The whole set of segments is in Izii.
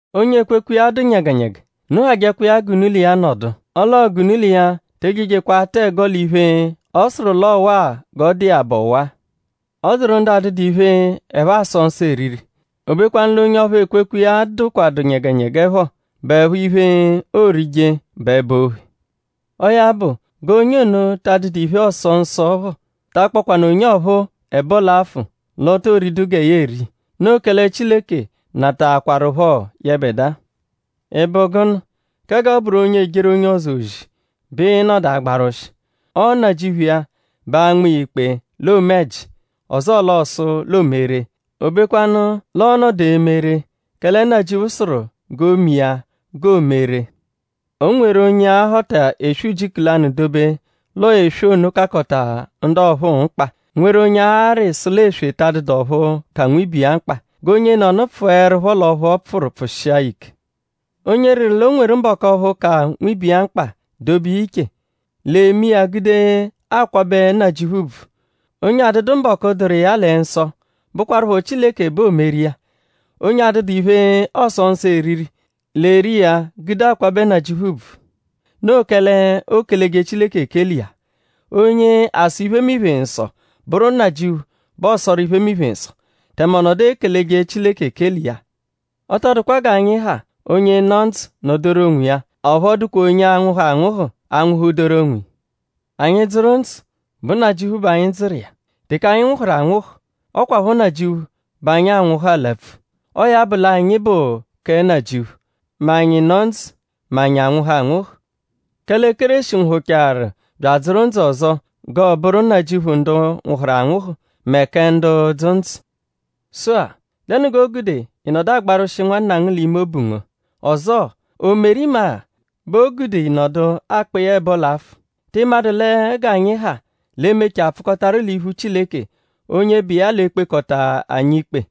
Onye ekwekwe iya dụ nyẹgenyege; unu hajẹkwa iya g'unu l'iya nọdu. Ọ l'ọo g'unu l'iya te ejejekwa atụ ẹgo l'iphe, ọ sụru l'ọo ọwa-a g'ọ dụ iya bụ ọwa. Ọ dụru ndu adụdu iphe, ẹphe asọ nsọ eriri; o bekwanụ l'onye ọphuu, ekwekwe iya dụkwadu nyẹgenyege phọ bụepho iphe, oorije bụ ẹba-ophe. Ọo ya bụ; g'onye ono, ta adụdu iphe, ọoso nsọ phọ ta akpọkwanu onye ọphuu ẹbo l'afụ l'o to ridu gẹ ya eri. Noo kẹle Chileke nataakwarụpho yẹbedua. ?Ị bụ gụnu? kẹ g'ọ bụru onye ejeru onye ọzo ozi bẹ ịi-nọdu agbarwụshi. Ọo Nnajịuphu iya bẹ a-nma iya ikpe l'oome ẹji; ọzoo l'ọosu l'oome ree. O bekwanụ l'ọo-nọdu eme ree; kẹle Nnajịuphu sụru g'oo-me iya g'o me ree. O nweru onye a-họta eswe ujiku lanụ dobe l'ọo eswe ono kakọta ndu ọphuu mkpa; nweru onye a-rị sụ l'eswe ta adụdu ọphu ka nwibe iya mkpa. G'onyenọnu pfụerupho l'ọphu ọ pfụru pfụshia ya ike. Onye rịru l'o nweru mbọku ọphu ka nwibe iya mkpa dobe iya iche; l'eme iya gude akwabẹ Nnajịuphu ùbvù. Onye adụdu mbọku, dụru iya lẹ nsọ bụkwarupho Chileke bẹ oomeru iya. Onye adụdu iphe, ọoso nsọ eriri l'eri iya gude akwabẹ Nnajịuphu ùbvù. Noo kẹle ookeleje Chileke ekele iya. Onye asọ iphemiphe nsọ bụru Nnajịuphu bẹ ọosoru iphemiphe nsọ; tẹme ọ nọdu ekeleje Chileke ekele iya. Ọ tọ dụkwa g'anyi ha; onye nọ ndzụ nọ-doru onwiya; ọphu ọ dụkwa onye anwụhu anwụhu anwụhu-doru onwiya. Anyi -dzụru ndzụ; bụ Nnajịuphu bẹ anyi dzụru iya; teke anyi anwụhu anwụhu; ọ kwaphọ Nnajịuphu bẹ anyi anwụhu alapfu. Ọo ya bụ l'anyi bụ kẹ Nnajịuphu: mẹ anyi nọ ndzụ; mẹ anyi anwụhu anwụhu. Kẹle Kéreshi nwụhuchaaru bya adzụru ndzụ ọzo g'ọo-bụru Nnajịuphu ndu nwụhuru anwụhu; mẹ kẹ ndu dzụ ndzụ. Sụ-a;?dẹnu g'o gude ị nọdu agbarwụshi nwanna ngu l'ime obu ngu? Ọzoo;?o meru imagha bẹ o gude ị nọdu akpọ iya ẹbo l'afụ??Tị madụ lẹ g'anyi ha l'e-mechaa pfụkotaru l'iphu Chileke; onye bụ iya l'e-kpekọta anyi ikpe?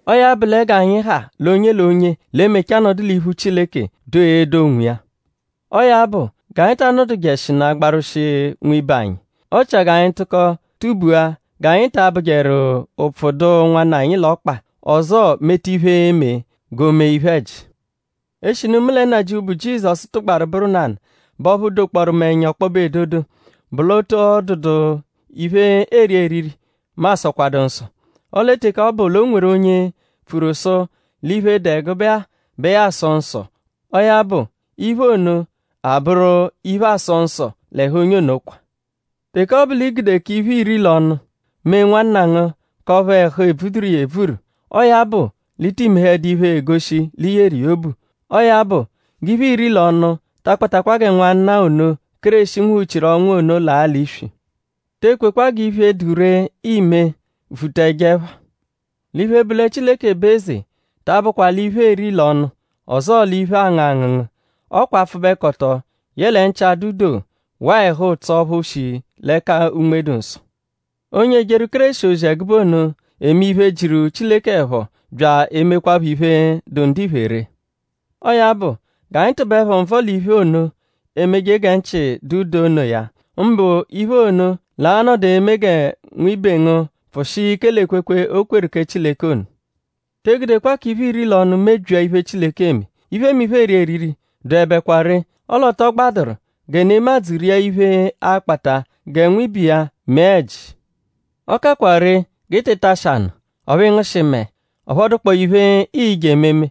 Ọo ya bụ lẹ g'anyi ha l'onye l'onye l'e-emecha nọdu l'iphu Chileke; doo edo onwiya. Ọo ya bụ; g'anyi ta anọdujeshinu agbarwụshi nwibe anyi. Ọ chia g'anyi tụko tubua g'anyi ta abụjeru ụpfu dụ nwanna anyi l'ọkpa; ọzoo meta iphe, e-me g'o mee iphe-ẹji. Eshinu mu lẹ Nnajịuphu, bụ Jizọsu tụgbaru bụru nanụ bẹ ọphu dokpọoru mu ẹnya ọkpobe edodo bụ l'ọ tọ dụdu iphe, eeri eriri, mu asọkwadu nsọ. Ọle teke ọ bụ l'o nweru onye pfuru sụ l'iphe, dụ ẹgube-a bẹ ya asọ nsọ; ọo ya bụ; iphe ono a-bụru iphe, aasọ nsọ l'ẹhu onye ono kwa. Teke ọ bụ l'i gude k'iphe, iiri l'ọnu mee nwanna ngu; k'ọphu ẹhu ebvuduru iya ebvuru; ọo ya bụ l'i ti mehẹdu iphe, egoshi l'i yeru iya obu. Ọo ya bụ; g'iphe, iiri l'ọnu ta akpatakwa gẹ nwanna ono, Kéreshi nwụhu-chiru ọnwu ono laa l'iswi. Te ekwekwa g'iphe, dụ ree, iime vuta ẹjo ẹpha. L'iphe, bụ lẹ Chileke bụ eze ta abụkwa l'iphe, eeri l'ọnu; ọzoo l'iphe, aangụ angụngu. Ọ kwa apfụbekoto; yẹle nchị-adụ-doo; waa ẹhu-ụtso ọphu shi l'ẹka Unme-dụ-Nsọ. Onye ejeru Kéreshi ozi ẹgube ono eme iphe, jiru Chileke ẹpho; bya emekwaphọ iphe, dụ ndiphe ree. Ọo ya bụ; g'anyi tụbeepho nvọ l'iphe ono, emeje gẹ nchị dụ doo onoya; mbụ iphe ono, l'a-nọdu eme gẹ nwibe ngu pfụshia ike l'ekwekwe, o kweru kẹ Chileke ono. Te egudekwa k'iphe, iiri l'ọnu mebyia iphe, Chileke eme. Iphemiphe, eeri eriri, dụebekwa ree. Ọle ọ tọ gbadụru gẹ nemadzụ ria iphe, a-kpata gẹ nwibe iya mee ẹji. Ọ kakwa ree g'ị tị tashị anụ; ọphu ị ngụshi mẹe; ọphu ọ dụkpoo iphe, ii-je ememe,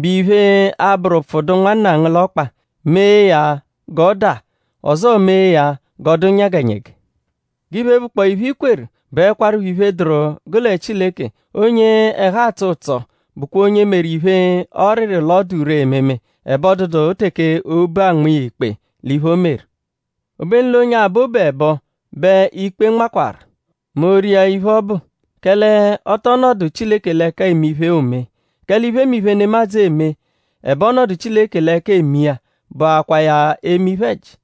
bụ iphe, a-bụru ụpfu dụ nwanna ngu l'ọkpa mee ya g'ọ daa; ọzoo mee ya g'ọ dụ nyẹgenyege. G'iphe, bụkpoo iphe, i kweru bụekwarupho iphe, dụru gụ lẹ Chileke. Onye ẹhu atsọ ụtso bụkwa onye meru iphe, ọ rịru l'ọ dụ ree ememe; ẹbe ọ dụdu teke obu anma iya ikpe l'iphe, o meru. Obenu l'onye abọ obu ẹbo bẹ ikpe nmakwaru mẹ o -ria iphe ọbu; kẹle ọ tọ nọdu Chileke l'ẹka eme iphe, oome. Kẹle iphemiphe, nemadzụ eme; ẹbe ọ nọdu Chileke l'ẹka eme iya bụakwaa ya eme iphe-ẹji.